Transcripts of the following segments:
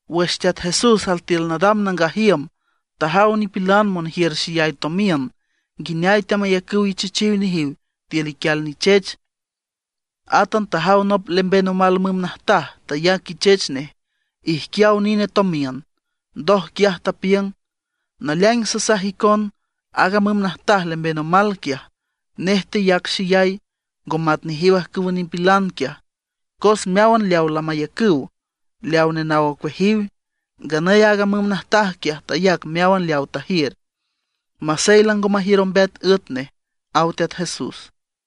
Wüx Teat Jesús altiül nadam nangaj iüm tajaw nipilan monjiür xeyay tomiün nguineay teamayacüw ichechiw nejiw tiül iquial nichech. Átan tajaw nop lemben omal müm najtaj tayac ichech nej ijquiaw nine tomiün. Ndoj quiaj tapiüng: ―Naleaing sasaj icon, aaga müm najtaj lemben omal quiaj, nej teyac xeyay, ngo mat nejiw ajcüwa nipilan quiaj. Cos meáwan lamayacüw leaw nenaw ocueajiw. Nganüy aaga müm najtaj quiaj tayac meáwan leaw tajiür, masey lango majiür ombeat üet nej ―aw Teat Jesús.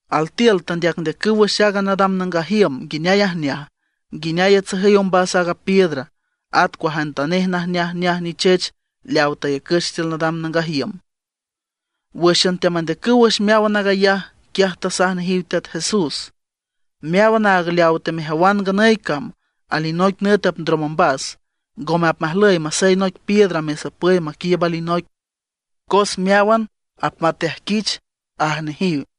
Altiül teandeacndeacüw wüx aaga nadam nangaj iüm nguineay ajneaj, nguineay atsajüy ombas aaga piedra, at cuajantanej najneajneaj nichech leaw tayacüch tiül nangaj iüm. Wǘxan teamandeacüw wüx meáwan aag ayaj, quiaj tasaj nejiw Teat Jesús: ―Meáwan aag leawa temejawan nganüy cam, alinoic nüt apndrom ombas. Ngome apmajlüy masey anoic piedra nesapüy maquiiüb alinoic, cos meáwan apmateajquich ―aj nejiw.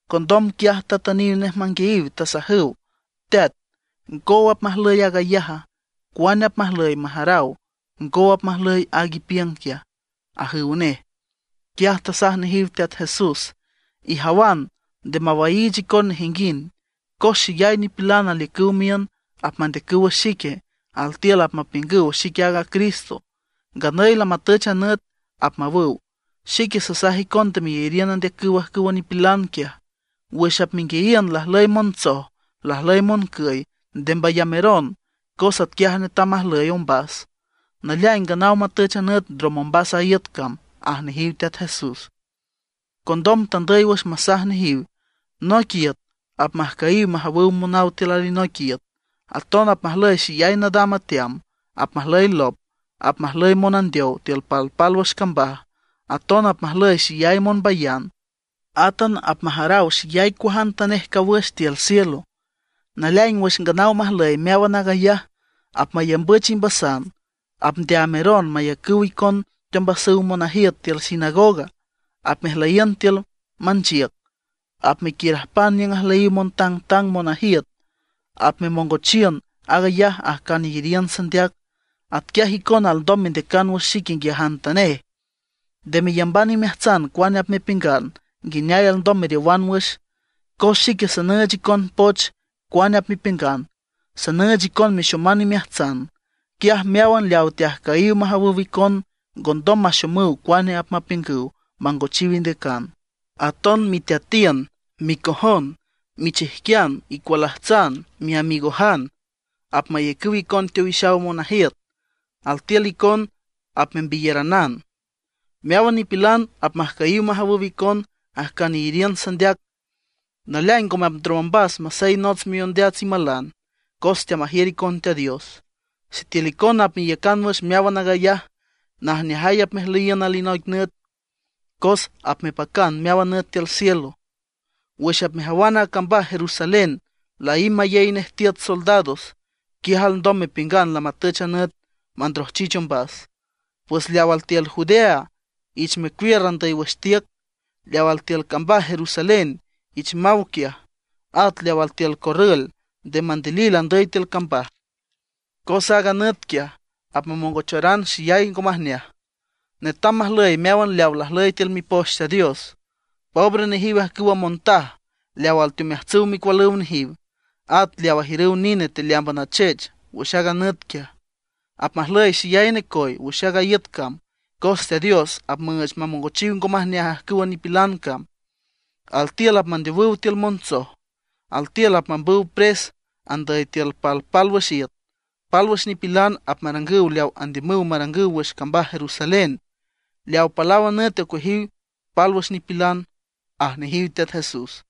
Condom quiaj tatüniw nej manguiayiw, tasajüw: ―Teat ¿ngow apmajlüy aag ayaja? ¿Cuane apmajlüy majaraw ngow apmajlüy aag ipiüng quiaja? ―ajüw nej. Quiaj tasaj nejiw Teat Jesús: ―Ijawan, nde mawaiich icon nejinguind. Cos xeyay nipilan aliücüw miün, apmandeacüw wüx xique. Altiül apmapiüngüw: “Xique aaga Cristo, nganüy lamatüch a nüt”, apmawüw. Xique sasaj icon nde meyariün andeacüw ajcüwa nipilan quiaj. Wüx apmenguiayiün lajlüy montsoj, lajlüy moncüy, nde mbayameron cos atquiaj netam majlüy ombas; naleaing nganaw matüch a nüt ndrom ombas a iüt cam ―aj nejiw Teat Jesús. Condom tandüy wüx masaj nejiw: ―Noic iüt apmajcüyiw majawüw monaw tiül alinoic iüt. Aton apmajlüy xeyay nadam ateam, apmajlüy lop, apmajlüy monandeow tiül palpálwüx cambaj; aton apmajlüy xeyay monbayan. Átan apmajaraw xeyay cuajantanej cawüx tiül cielo. ’Naleaing wüx nganaw majlüy meáwan aag ayaj, apmayambüch imbasan, apndeaameron mayacüw icon teombasüw monajiüt tiül sinagoga. Apmejmeliün tiül manchiüc; apmequiürajpan niüng ajlüyiw montangtang monajiüt. Apmemongochiün aag ayaj ajcan iyariün sandeac. Atquiaj icona alndom mendeacan wüx xic nguiajantanej. Nde meyamban imeajtsan cuane apmepiüngan, nguineay alndom meriowan wüx. Cos xique sanüüch icon poch cuane apmepiüngan; sanüüch icon mexoman imeajtsan. Quiaj meáwan leawa teajcüyiw majawüw icon ngondom maxomüw cuane apmapiüngüw mangochiw indeacan. Aton miteatiün, micojon, michijquian, icualajtsan, miamigojan, apmayacüw icon teowixaw monajiüt. Altiül icon apmembiyaranan. Meáwan nipilan apmajcüyiw majawüw icon ajcan iyariün sandeac. Naleaing ngome apndrom ombas masey nots miondeats imalan, cos teamajiür icon Teat Dios. Sitiül icona apmeiücan wüx meáwan aag ayaj, najneajay apmejlüyiün alinoic nüt, cos apmepacan meáwan nüt tiül cielo. ’Wüx apmejawan a cambaj Jerusalén laímb mayey nej tiüt soldados, quiaj alndom mepiüngan lamatüch a nüt mandrojchich ombas. Pues leaw altiül Judea ich mecuiür andüy wüx tiüc; leaw altiül cambaj Jerusalén ich maw quiaj; at leaw altiül corrül nde mandilil andüy tiül cambaj. Cos aaga nüt quiaj apmamongocharan xeyay ngo majneaj. Netam majlüy meáwan leawa lajlüy tiül Mipoch Teat Dios. ¡Pobre nejiw ajcüwa montaj leaw alteomeajtsüw micualüw nejiw, at leaw ajiür nine tealeámban achech wüx aaga nüt quiaj! Apmajlüy xeyay necoy wüx aaga iüt cam, cos Teat Dios apmüüch mamongochiw ngo majneaj ajcüwa nipilan cam. Altiül apmandeowüw tiül montsoj; altiül apmambüw pres andüy tiül palpálwüx iüt; pálwüx nipilan apmarangüw leaw andiümüw marangüw wüx cambaj Jerusalén, leaw palaw a nüt ocueajiw pálwüx nipilan ―aj nejiw Teat Jesús.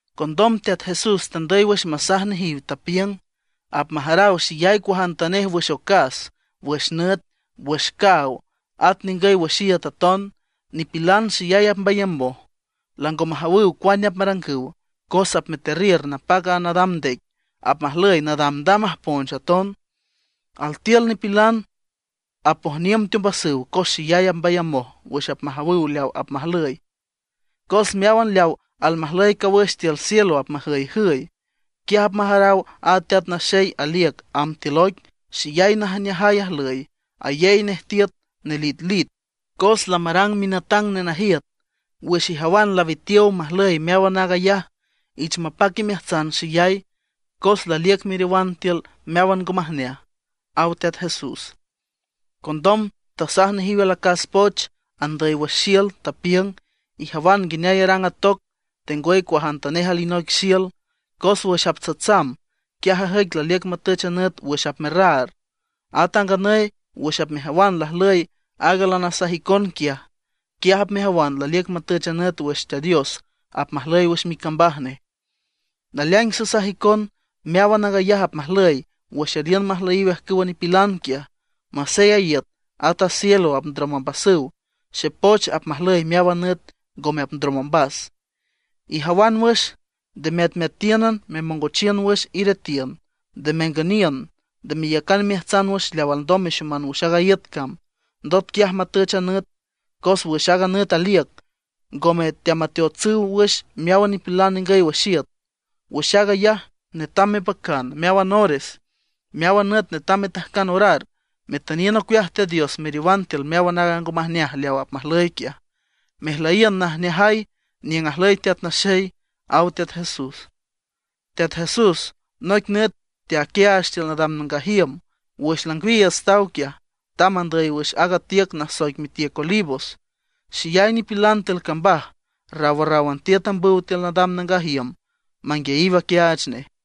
Condom Teat Jesús tandüy wüx masaj nejiw, tapiüng: ―Apmajaraw xeyay cuajantanej wüx ocas, wüx nüt, wüx caaw, at ningüy wüx iüt aton. Nipilan xeyay apmbayamoj, lango majawüw cuane apmarangüw, cos apmeterriür napac a nadam ndec, apmajlüy nadamdam ajponch aton. Altiül nipilan apojniüm teombasüw cos xeyay apmbayamoj wüx apmajawüw leawa apmajlüy, cos meáwan leaw almajlüy cawüx tiül cielo apmajüyjüy. Quiaj apmajaraw aaga Teat Naxey aliüc amb tiül oic xeyay najneajay ajlüy, ayey nej tiüt nelitlit, cos lamarang minatang nenajiüt. Wüx ijawan lawitiow majlüy meáwan aag ayaj, ich mapac imeajtsan xeyay, cos laliüc meriowan tiül meáwan ngo majneaj ―aw Teat Jesús. Condom tasaj nejiw alacas poch andüy wüx xiül, tapiüng: ―Ijawan nguineay arang a toc, tengwüy cuajantanej alinoic xiül. Cos wüx aptsatsam, quiaj ajüic laliüc matüch nüt wüx apmerraar. At a nganüy wüx apmejawan lajlüy aag lanasaj icon quiaj, quiaj apmejawan laliüc matüch a nüt wüx Teat Dios apmajlüy wüx micambaj nej. ’Naleaing sasaj icon, meáwan aag ayaj apmajlüy wüx aliün majlüyiw ajcüwa nipilan quiaj. Masey a iüt at a cielo apndrom ombasüw, xepoch apmajlüy meáwan nüt, ngome apndrom ombas. ’Ijawan wüx, nde meatmeatíünan memongochiün wüx iretiün, nde mengüniün, nde meyacan imeajtsan wüx leaw alndom mexoman wüx aaga iüt cam, ndot quiaj matüch a nüt. Cos wüx aaga nüt aliüc, ngome teamateotsüw wüx meáwan nipilan ningüy wüx iüt. Wüx aag ayaj netam mepacan, meáwan ores meáwan nüt netam metajcan orar, metüniün ocueaj Teat Dios meriowan tiül meáwan aaga ngo majneaj leaw apmajlüy quiaj, mejlüyiün najneajay niüng ajlüy Teat Naxey ―aw Teat Jesús. Teat Jesús, noic nüt teaquiaach tiül nadam nangaj iüm. Wüx langwiiüts taw quiaj; tamb andüy wüx aaga tiüc nasoic mitiüc Olivos. Xeyay nipilan tiül cambaj rawrráwan tiüt ambüw tiül nadam nangaj iüm manguiayiw aquiaach nej.